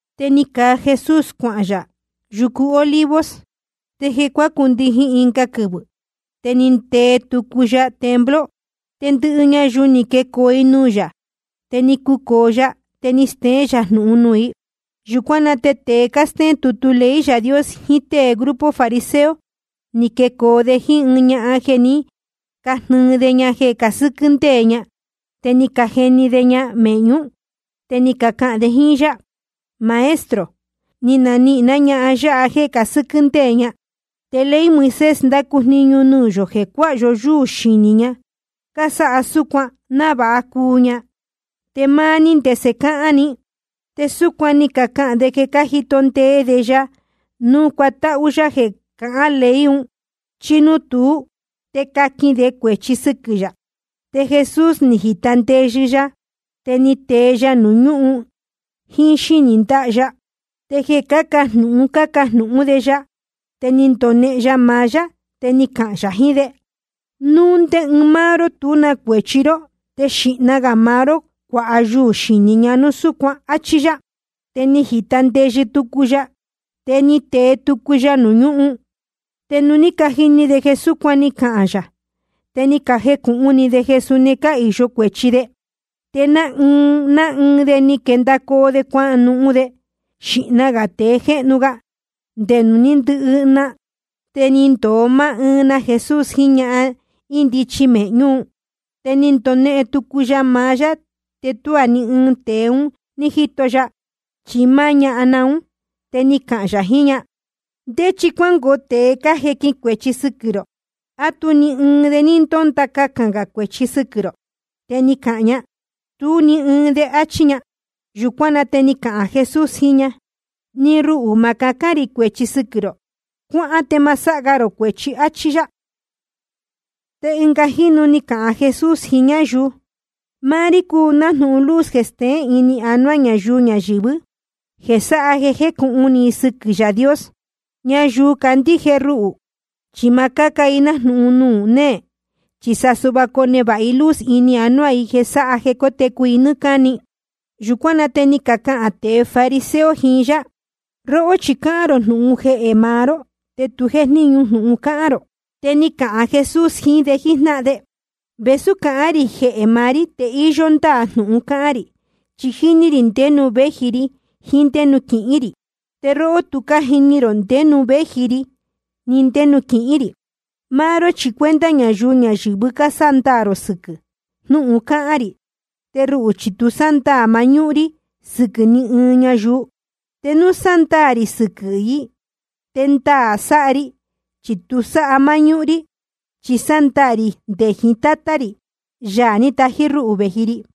Te ni caa Jesús cuahān yā yucu Olivos. Te jeē cuácundijin ɨnga quɨvɨ̄, te ni ndee tucu ya templo. Te ndɨhɨ ñayuu ni quecoo i nuū yā. Te ni cucōo ya, te ni steén yā jnūhun nuū i. Yūcuán na te tēe cástéén tutu ley Yaā Dios jiín tée grupo fariseo, ni quecoo de jíín ɨɨn ñahan jeē ní canihīn de ña jeē casɨ́quɨ́ ndéē ña. Te ni cajeni de ña mēhñú. Te ni cacahān de jíín yá: Maestro, ni canihīn ná ñahan yáha jéē casɨ́quɨ́ ndéē ña. Te ley Moisés ndácu jniñu nuū yō jeē cuáha yó yúū xinī ñahan cásáha súcuan návāha cuu ña. Te máá ní, ¿ndese cáhán ni? Te súcuan ni cacahān de jeē cájito ndee de ya núu cuatáhú yá jeē cahán ley un, chi núu tuú te caquin de cuēchi sɨquɨ̄ yā. Te Jesús ni jīta ndeyɨ ya, te ni tee ya nuū ñúhun jíín xínī ndáha ya. Te jeē cácajnūhun cácajnūhún de ya, te ni ndonehen ya maá yá, te ni cahān yā jiín de: Núu ndé ɨɨn máá ró tú na cuēchi ró, te xīhna gā maá ró cuāha yuū xinī ña núu súcuan, áchí yá. Te ni jīta ndeyɨ tucu ya, te ni tee tucu ya nuū ñúhun. Te nuū ní cajini de jeē súcuan ni cahān yā, te ni cajecūhun ni de jeē suni cáhīyo cuēchi de. Te ná ɨɨn ná ɨɨn de ni quendacoo de cuahān de, xīhna gā tēe jéhnu ga te nde nuū ní ndɨhɨ na. Te ni ndōo máá ɨɨn na Jesús jiín ñahan índichi mēhñú un. Te ni ndonehen tucu ya maá yá, te tuá ni ɨɨn tēe un ní jíto ya, chi máá na ñahan ún. Te ni cahān yā jiín ña: ¿Ndé chi cuángoo tēe cájequin cuēchi sɨquɨ̄ rō? ¿A tú ni ɨɨn de ní ndónda cahān gā cuēchi sɨquɨ̄ rō? Te ni cahān ña: Tú ni ɨɨn de, áchí ña. Yūcuán na te ni cahān Jesús jiín ña: Ni ruhū, ma cahán rī cuēchi sɨquɨ̄ rō. Cuáhán te ma sáha ga rō cuēchi, áchí yá. Te ɨnga jínu ni cahān Jesús jiín ñáyuu: Máá rí cúu nájnūhun luz jeē steén ini anuá ñayuu ñayɨ̄vɨ́, jeē sáha jeē jécūhun ni i sɨquɨ̄ Yaā Dios. Ñayuu candíje ruhū chi ma cáca i nájnūhun nuū néē, chi sa suhva conevāha i luz ini anuá i jeē sáha jeē cótecu i nɨ́ɨ́ cáni. Yūcuán na te ni cacahān tēe fariseo jiín yá: Róhó chi cáhán rō jnūhun jehē maá ró, te tu jéjníñu jnūhun cáhán rō. Te ni cahān Jesús jiín de jíjnáhan de: Vēsú cáhán rī jehē maá rí, te íyó ndáā jnūhun cáhán rī. Chi jíní rī ndé nuū véji ri jiín ndé nuū quihín rī. Te róhó tu cájini rō ndé nuū véji ri ni ndé nuū quihín rī. Máá ró chi cuenta ñayuu ñayɨ̄vɨ cásándaā rō sɨquɨ̄ jnúhun cáhán rī. Te ruhū chi tu sándaā mañúhún rí sɨquɨ̄ ni ɨɨn ñayuu. Te núu sándaā rī sɨquɨ̄ i, te ndaā sáha ri, chi tu sáha máñúhún rí, chi sándaā rī nde jiín máá Tátá rī, Yaā ní tají rúhū vēji ri.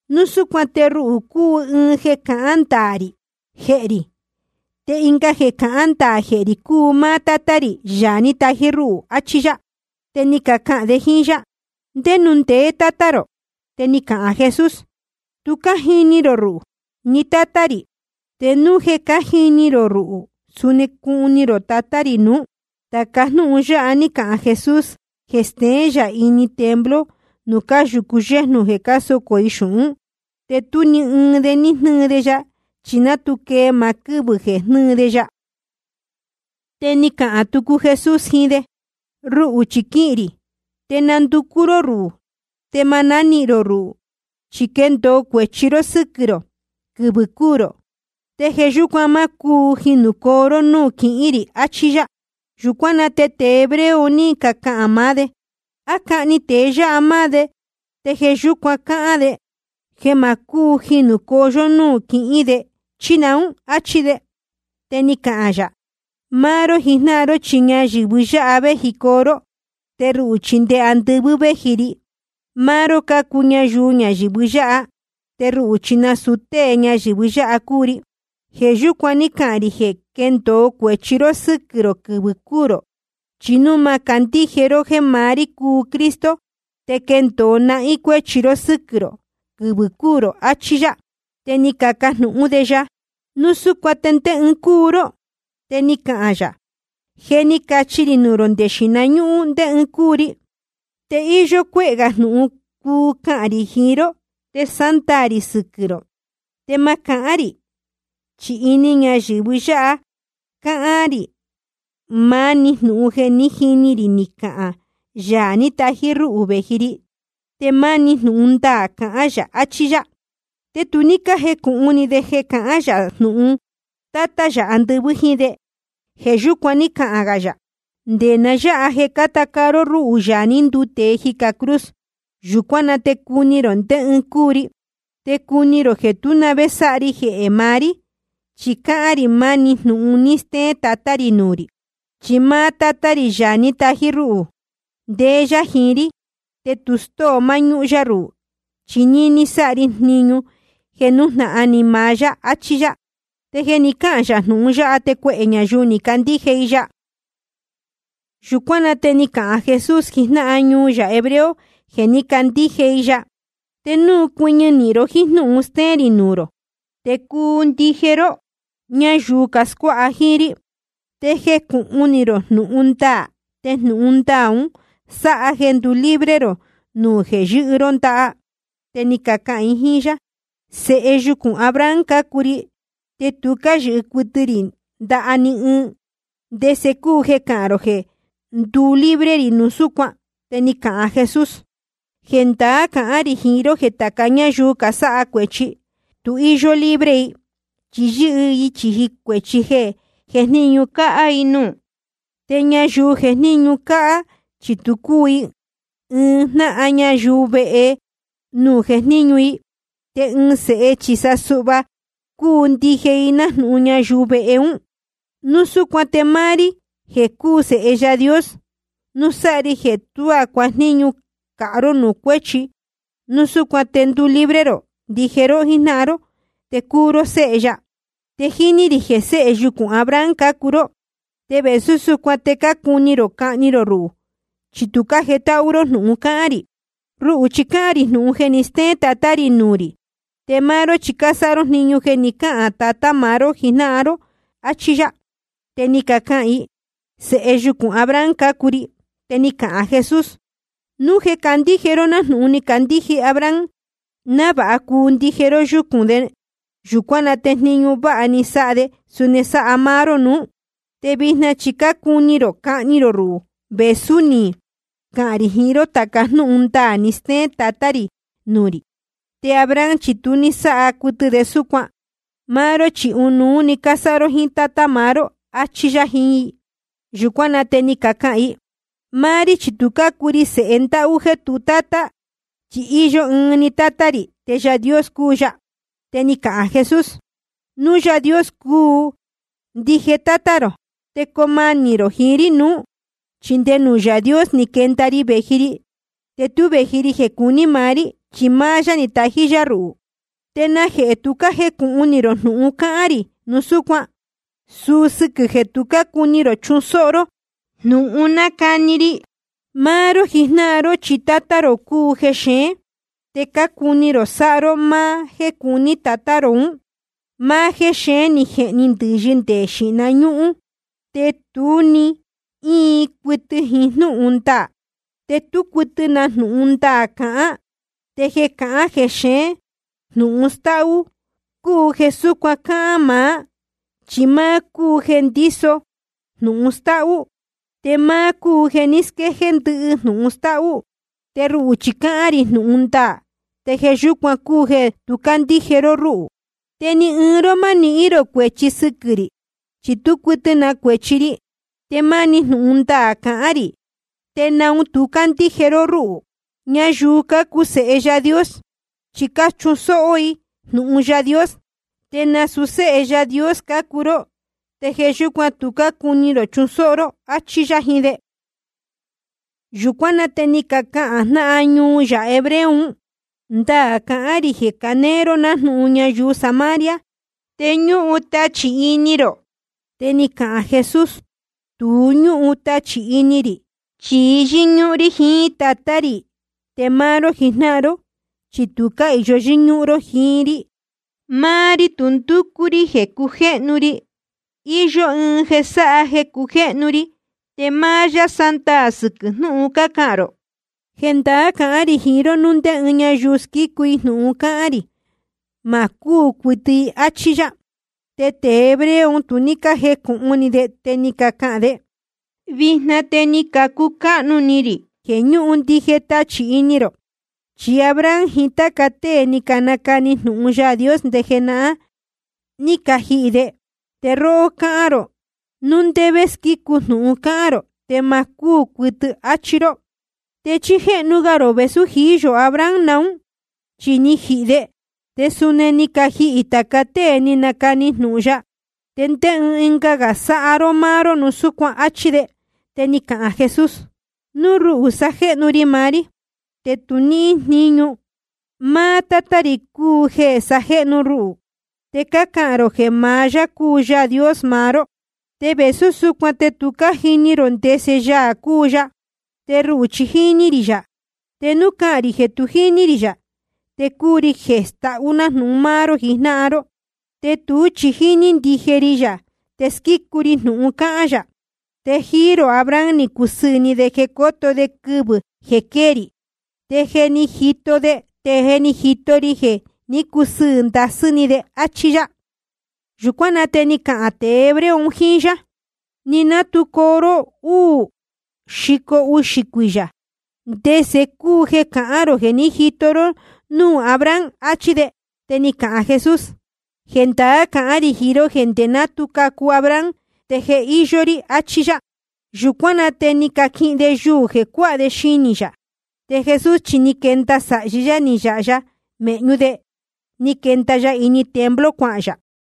Núu súcuan te ruhū cúu ɨɨn jeē cahán ndaā rī jehē rī. Te ɨnga jeē cahán ndaā jehē rī cúu máá Tátá rī, Yaā ní tají rúhū. Achí yá. Te ni cacahān de jíín yá: ¿Ndé nuū ndeé Tátá rō? Te ni cahān Jesús: Tu cájini rō ruhū ni Tátá rī. Te núu jeē cájini rō ruhū, suni cuni rō Tatá rī nuú. Tāca jnúhun yáha ní cahān Jesús jeē steén yā ini templo nuū cáyūcu yéjnū jeē cásocō i xūhún. Te tú ni ɨɨn de ní jnɨ́ɨ de ya, chi ná tu quee maá quɨ́vɨ̄ jeē jnɨ́ɨ de ya. Te ni cahān tucu Jesús jiín de: Ruhū chi quihīn rī, te nanducú ró rúhū, te ma nánihīn rō ruhū, chi quendōo cuēchi ró sɨquɨ̄ rō quɨvɨ̄ cúū rō. Te jeē yúcuan má cúu jinūcoo ró núū quihín rī, achí yá. Yūcuán na te tēe hebreo un ní cacahān maá de: ¿A cahni tēe yáha máá de, te jeē yúcuan cáhán de jeē ma cúu jinūcoo yó núū quihín de, chí naún? Achí de. Te ni cahān yā: Máá ró jijnáhan ró chi ñayɨ̄vɨ yáha véjicoo ró, te ruhū chi nde andɨvɨ́ véji ri. Máá ró cácuu ñayuu ñayɨ̄vɨ yáha, te ruhū chi nasūu tée ñayɨ̄vɨ yáha cúu ri. Jeē yúcuan ní cahān rī jeē quendōo cuēchi ró sɨquɨ̄ rō quɨvɨ̄ cúū rō. Chi núu ma candíje ró jéē maá rí cúu Cristo, te quendōo nahín cuéchi ró sɨquɨ̄ rō quɨvɨ̄ cúū rō. Achí yá. Te ni cacajnūhún de ya: Núu súcuan ¿te ndé ɨɨn cúu ró? Te ni cahān yā: Je ni cachi ri nuū rō nde xīhna ñúhún ndé ɨɨn cúu ri. Te íyó cuéhē gā jnūhun cuu cahān rī jiín ró te sándaā rī sɨquɨ̄ rō. Te ma cahán rī, chi ini ñayɨ̄vɨ yáha cáhán rī maá‑ni jnūhun jeē ní jini ri ni cahān Yaā ní tají rúhū vēji ri. Te máni jnūhun ndaā cahán yā. Achí yá. Te tu ní cájecūhun ni de jeē cahán yā jnūhun Tátá yā andɨvɨ́ jíín de. Jeē yúcuan ní cahān gā yā: Nde na yáha jeē cáta caa ró rúhū, Yaā ní nduu tēe, jicā cruz, yūcuán na te cuni rō ndé ɨɨn cúu ri. Te cuni rō jeē tú na vé sáha ri jeē maá rí, chi cáhán rī maá‑ni jnūhun ni steén Tatá rī nuū rī. Chi máá Tátá rī, Yaā ní tají rúhū, ndéé yá jiín rí. Te tu stóo máñúhún yá ruhū, chi níní sáha ri jniñu jeē nújnahan ni maá yá. Achí yá. Te jeē ni cáhān yā jnūhun yáha, te cuehē ñayuu ni cacandíje i ya. Yūcuán na te ni cahān Jesús jiín jnáhan ñuu yā hebreo jeē ní cacandíje i ya: Te núu cuɨñɨ nīhin ró jíín jnúhun stéén rī nuū rō, te cuu ndije ró ñáyuu scuáha jíín rí. Te jecūhun ni rō jnūhun ndaā, te jnūhun ndaā un sáha jeē nduu libre rō nuū jeē yɨ́hɨ ró ndaha. Te ni cacahān i jíín yá: Sēhe yucūn Abraham cácuu ri, te tu cáyɨhɨ cuɨtɨ rī ndaha ni ɨɨn. ¿Te ndese cúu jeē cahán rō jeē nduu libre rī núu súcuan? Te ni cahān Jesús: Jendaá cahán rī jiín ró jeē tāca ñáyuu casáha cuēchi, tu íyó libre i, chi yɨ́hɨ i chīji cuēchi jeē jejníñu cāhá i nuū. Te ñayuu jejníñu cāhá, chi tu cúu i ɨɨn jnáhan ñayuu vehe nuū jejníñu i. Te ɨɨn sēhe chi sa suhva cúu ndije i jnáhan ñayuu vehe ún. Núu súcuan te máá rí jeē cúu Sēhe Yaā Dios, núu sáha ri jeē tuá cuajníñu cāhá ró nuū cuéchi, núu súcuan te nduu libre ndije ró jíjnáhan ró, te cuu ró séhe ya. Te jíní rī jeē séhe yucūn Abraham cácuu ró, te vēsú súcuan te cácuni rō cahni rō ruhū, chi tu cájetáhú ró jnūhun cáhán rī. Ruhū chi cáhán rī jnūhun jeē ni stéén Tatá rī nuū rī. Te máá ró chi cásáha ró jniñu jeē ni cáhān tatá maá ró jijnáhan ró. Achí yá. Te ni cacahān i: Sēhe yucūn Abraham cácuu ri. Te ni cahān Jesús: Núu jeē candíje ró nájnūhun ni candíje Abraham návāha cuu ndije ró yúcūn de, yūcuán na te jniñu váha ni sáha de suni sáha máá ró nuú. Te vijna chi cácuni rō cahni rō ruhū, vēsú ni cahān rī jiín ró tāca jnúhun ndaā ni steén Tatá rī nuū rī. Te Abraham chi tu ní sáha cuɨtɨ de súcuan. Máá ró chi ɨnuú cásáha ró jíín tátá maá ró. Achí yá jiín i. Yūcuán na te ni cacahān i: Máá rí chi tu cácuu ri sēhe ndáhú jéē tu tátá. Chi íyó ɨɨn‑ni tátá rī, te Yaā Dios cúu ya. Te ni cahān Jesús: Núu Yaā Dios cúu ndije tátá rō, te coo manī rō jiín rí nuú. Chi nde nuū Yaā Dios ni quenda ri vēji ri. Te tú vēji ri jeē cuní maá rí, chi máá yá ni tají rúhū. ¿Te najehē tu cájecūhun ni rō jnūhun cáhán rī núu súcuan? Suu sɨquɨ̄ jeē tu cácuni rō chusóhó ró jnúhun nácani ri. Máá ró jijnáhan ró chi tátá rō cúu jexeén. Te cácuni rō sáha ró máá jéē cuní tatá rō ún. Máá jéxeén ni jehni ndɨ̄yɨ nde jeē xíhna ñúhún. Te tu ní íin cuɨtɨ jiín jnúhun ndaā, te tú cuɨtɨ na jnūhun ndaā cahán. Te jeē cahán jexeén jnūhun stáhú cúu jeē súcuan cáa máá. Chi máá un cúu jeē ndíso jnūhun stáhú, te máá un cúu jeē ní squéjéé ndɨhɨ jnūhun stáhú. Te ruhū chi cáhán rī jnūhun ndaā, te jeē yúcuan cúu jeē tu cácandíje ró rúhū. Te ni ɨɨn ró ma nihín rō cuēchi sɨquɨ̄ rī, chi tú cuɨtɨ na cuēchi ri. Te máni jnūhun ndaā cahán rī, ¿te naun tu cácandíje ró rúhū? Ñayuu cácuu sēhe Yaā Dios, chi cáchusóhó i jnūhun Yaā Dios. Te nasūu séhe Yaā Dios cácuu ró, te jeē yúcuan tu cácuni rō chusóhó ró. Achí yá jiín de. Yūcuán na te ni cacahān jnáhan ñuu yā hebreo un: Ndaā cácahān rī jeē canéé ró nájnūhun ñayuu Samaria, te ñúhun tachī ini rō. Te ni cahān Jesús: Tu ñúhun tachī ini rī, chi yɨ́ñúhún rí jiín Tátá rī. Te máá ró jijnáhan ró chi tu cáhīyo yɨ́ñúhún ró jiín rí. Máá rí tu ndúcú rí jeē cujéhnu ri. Iyó ɨɨn jeē sáha jeē cujéhnu ri, te máá yá sándaā sɨquɨ̄ jnúhun cácahān rō. Jendaá cahán rī jiín ró, núu ndé ñáyuu squícu jnūhun cáhán rī, ma cúū cuɨtɨ i. Achí yá. Te tēe hebreo un tu ní cájecūhun ni de, te ni cacahān de: Vijna te ni cacucáhnu ni rī jeē ñúhun ndije tachī ini rō. Chi Abraham jiín táca tée ni canacani jnūhun Yaā Dios nde jenahán, ni cajihī de. Te róhó cáhán rō, núu ndé vé squícu jnūhun cáhán rō, te ma cúū cuɨtɨ i, áchí ró. ¿Te chí jéhnu ga rō vēsú jií yō Abraham naún? Chi ni jihī de, te suni ni cajihī tāca tée ni canacani jnūhun ya. ¿Te ndé ɨɨn ga sáha ró máá ró núu súcuan? Achí de. Te ni cahān Jesús: Núu ruhū sajéhnu ri maá rí, te tu níhín jníñu. Máá Tátá rī cúu jeē sajéhnu ruhū. Te cácahān rō jeē maá yá cúu Yaā Dios maá ró. Te vēsú súcuan te tu cájini rō ndese Yaā cúu ya. Te ruhū chi jíní rī yā. Te núu cahān rī jeē tu jíní rī yā, te cuu ri tēe stáhú nájnūhun máá ró jijnáhan ró. Te tuú chi jíní ndije ri yā, te squícu ri jnūhun cáhán yā. Te jíí rō Abraham ni cusɨɨ̄ ni de jeē coto de quɨvɨ̄ quéē rī. Te je ni jito de, te ni jito ri jeē ní cusɨɨ̄ ndasɨ́ ni de. Achí yá. Yūcuán na te ni cacahān tēe hebreo un jíín yá: Ni ná tu coo ró uū xico uxī cuiyā, ¿te ndese cúu jeē cahán rō jeē ní jito ró núū Abraham? achí de. Te ni cahān Jesús: Jendaá cahán rī jiín ró jeē nde ná tu cacu Abraham te je íyó rí, achí yá. Yūcuán na te ni caquihin de yuū jeē cuáha de xinī yā. Te Jesús chi ni quenda sāhi yá ni yāha ya mēhñú de, ni quenda ya ini templo cuahān yā.